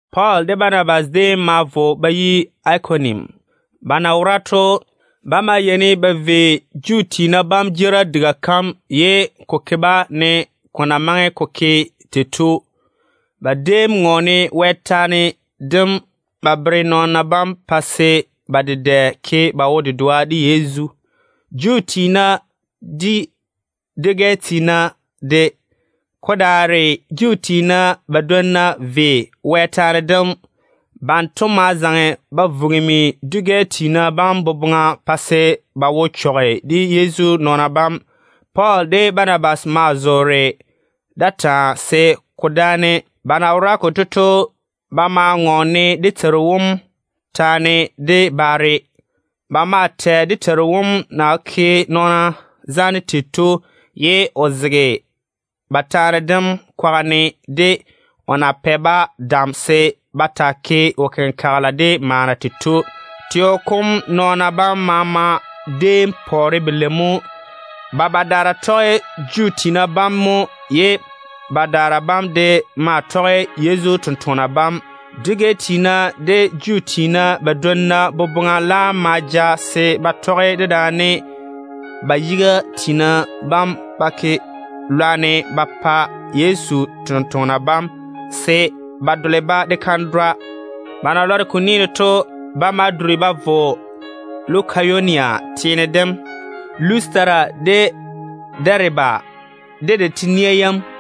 Pɔɔl de Banabas déem ma vo ba yi Ikonium. Ba na wora to, ba yeini ba vei Juu tiina jeerim diga kam, ye ko ke-ba ne ko na maŋe ko ke tei to. Ba déem ŋɔɔne Wɛ taane dem ba bere nɔɔna bam pa se ba dedɛ ke ba wo-dedoa de Yezu, Juu tiina de dwi-gɛ tiina de. Ko daare Juu tiina badwonna ve Wɛ taane dem. Banto ma zaŋe ba vugimi dwi-gɛ tiina bam boboŋa pa se ba wo chɔge de Yezu nɔɔna bam. Pɔɔl de Banabas maa zoore da taa se ko dáane. Ba na wora konto to, ba maa ŋɔɔne dé Teiru wom taane de baare. Ba maa tɛ dé Teiru wom na ke nɔɔna zaane tei to, ye o zege ba taane dem kwaga ne de o na pɛ-ba dam se ba taa ke wo-kenkagela de maana tei to. Teo kom nɔɔna bam maama déem pɔɔre belei mo. Ba badaara tɔge Juu tiina bam mo, ye badaara bam de maa tɔge Yezu totoŋa nakwa bam. Dwi-gɛ tiina de Juu tiina badwonna boboŋa laam ma ja se ba tɔge dedaane ba yiga tiina bam ba ke lwarem ba pa Yezu tontoŋena bam, se ba dole-ba de kandwa ba go. Ba na lɔre ko ni ne to, ba ma duri ba vo Lukayonia teene Lustera de Dɛɛbe, de de nawuura yam.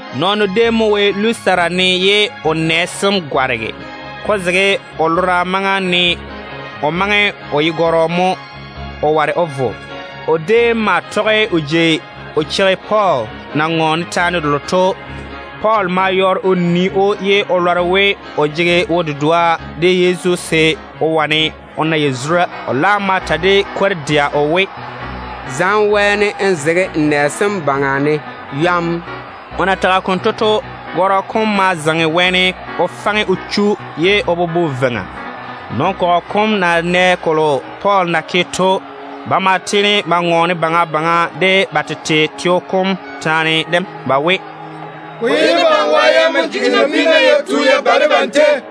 Nɔɔno déem mo wo Lustera ne ye o nɛ sem gwarege. Ko zege o lora maŋa ne o maŋe o ye gɔrɔ mo, o ware o vo. O déem maa tɔge o jei o cheigi Pɔɔl na ŋɔɔne taane delo to. Pɔɔl ma yɔɔre o nii‑o ye o lɔre we o jege wo-dedoa de Yezu se o wane o na yazura. O laam ma ta de kwor-dɛa o we, “Zaŋe wɛɛne n zege n nɛ sem baŋa ne yɔm!” O na tage konto to, gɔrɔ kom ma zaŋe wɛɛne o faŋe o chu ye o bobo veiŋa. Nɔn-kɔgɔ kom na nɛ kolo Pɔɔl na ke to, ba ma tiini ba ŋɔɔne baŋa baŋa de ba tete teo kom taane dem ba we, “Ko ye debam wa yam mo jigi nabiina ya tu ya ba debam tei.”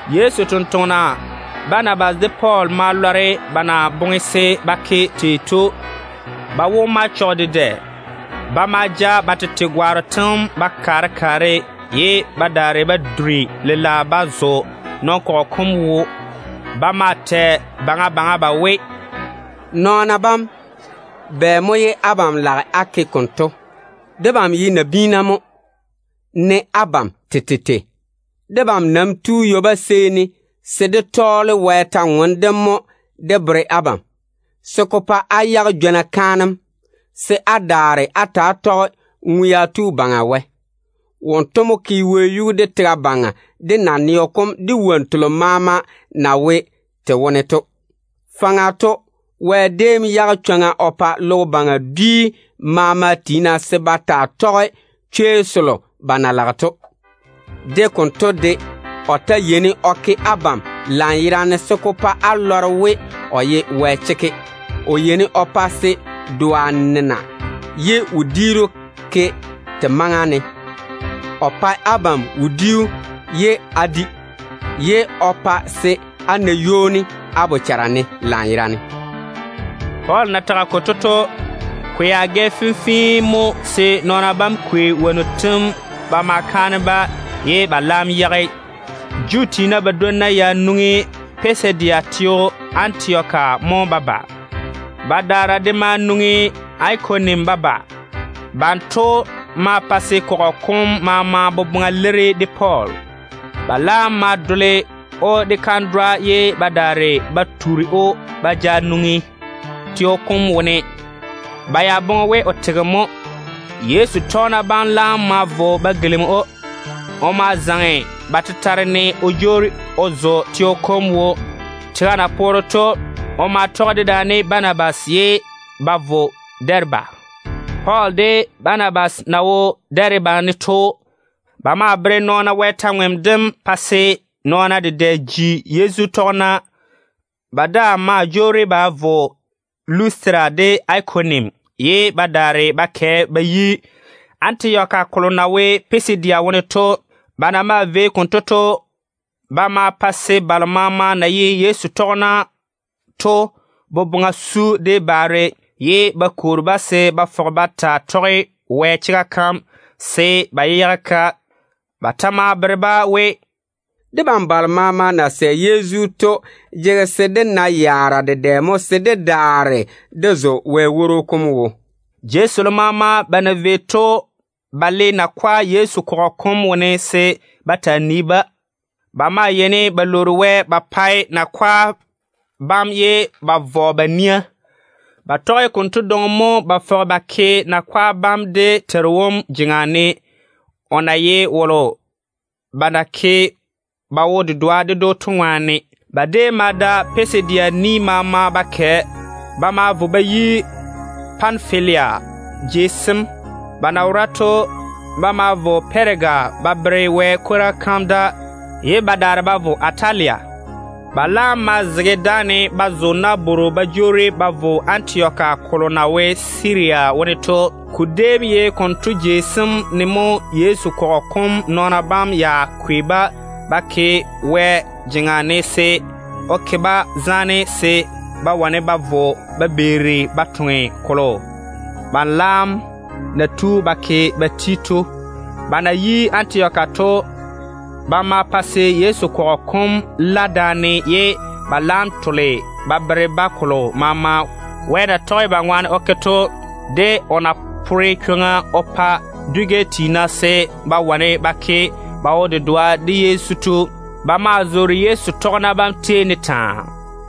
Yezu totoŋa nakwa Banabas de Pɔɔl ma lɔre ba na boŋe se ba ke tei to. Ba wo ma chɔge dedɛ. Ba ma ja ba tete gwaaro tem ba kaare kaare, ye ba daare ba duri lela ba zo nɔn-kɔgɔ kom wo. Ba maa tɛ baŋa baŋa ba we, “Nɔɔna bam, bɛ mo ye abam lage á ke konto? Debam ye nabiina mo, ne abam tete tei. Debam nam tu ywoba seeni se dé tɔɔle Wɛ kwor-ywoŋa kam mo dé bere abam, se ko pa á yage jwona kaanem, se á daare á ta‑á tɔge ŋwea tu Baŋa Wɛ. Wonto mo ke wɛyuu, de tega baŋa, de naneo kom, de wonnu telo maama na wo te wone to. Faŋa to Wɛ déem yage chwoŋa o pa logo baŋa dwi maama tiina se ba taa tɔge chwei selo ba na lage to. De konto de o ta yeini o ke abam lanyerane se ko pa á lɔre we o ye Wɛ chekke. O yeini o pa se doa nena ye wodiiru ke te maŋa ne. O maa pae abam wodiu ye á di, ye o pa se á na ywoni á bochara ne lanyerane.” Pɔɔl na tage konto to, ko ya gɛ fenfee mo se nɔɔna bam kwei wonnu tem ba ma kaane-ba, ye ba laam yage. Juu tiina badwonna ya nwoŋi Pisidia teo Antioka mo ba ba. Badaara de ma nwoŋi Ikonium ba ba. Banto ma pa se kɔgɔ kom maama boboŋa leiri de Pɔɔl. Ba laam ma dole‑o de kandwa ye ba daare ba tuuri‑o ba ja nwoŋi teo kom wone. Ba ya boŋe we o tege mo. Yezu tɔgena bam laam ma vo ba gilimi‑o. O ma zaŋe ba tetare ne o jwoori o zo teo kom wo. Tega na poore to, o ma tɔge dedaane Banabas ye ba vo Dɛɛbe. Pɔɔl de Banabas na wo Dɛɛbe ne to, ba ma tɔɔle Wɛ kwor-ywoŋa kam ba bere nɔɔna pa se ba dedɛ ji Yezu tɔgena. Ba daa ma jwoori ba vo Lustera de Ikonium, ye ba daare ba kɛ ba yi Antioka kolo na wo Pisidia wone to. Ba na maa vei konto to, ba ma pa se balo maama na ye Yezu tɔgena to boboŋa su de baare, ye ba kwoori-ba se ba fɔge ba taa tɔge Wɛ chega kam, se ba yé yage-ka. Ba ta ma bere-ba we, “Debam balo maama na sɛ Yezu to jege se dé na yaara dedɛ mo se dé daare dé zo Wɛ woro kom wo.” Jei selo maama ba na vei to, ba déem le nakwa Yezu kɔgɔ kom wone se ba taa nii-ba. Ba ma yeini ba lwoori Wɛ ba pa nakwa bam ye ba vɔ ba nia Wɛ ŋwaane. Ba tɔge konto dwoŋi mo ba fɔge ba ke nakwa bam dé Teiru wom jeŋa ne, o na ye wolo ba na ke ba wo-dedoa ded‑o to ŋwaane. Ba déem ma da Pisidia ni maama ba kɛ. Ba ma vo ba yi Panfilia jei sem. Ba na wora to, ba ma vo Pɛɛga ba bere Wɛ kwora kam da, ye ba daare ba vo Atalia. Ba laam ma zege dáane ba zo nabworo ba jwoori ba vo Antioka kolo na wo Siria wone to. Ko déem ye konto jei sem ne mo Yezu kɔgɔ kom nɔɔna bam ya kwei-ba ba ke Wɛ jeŋa ne se o ke-ba zaane se ba wane ba vo ba beeri ba toŋe kolo ba laam na tu ba ke ba ti to. Ba na yi Antioka to, ba ma pa se Yezu kɔgɔ kom la daane, ye ba laam tole ba bere-ba kolo maama Wɛ na tɔge ba ŋwaane o ke to, de o na pore chwoŋa o pa dwi-gɛ tiina se ba wane ba ke ba wo-dedoa de Yezu to. Ba maa zoore Yezu tɔgena bam tei ne taa.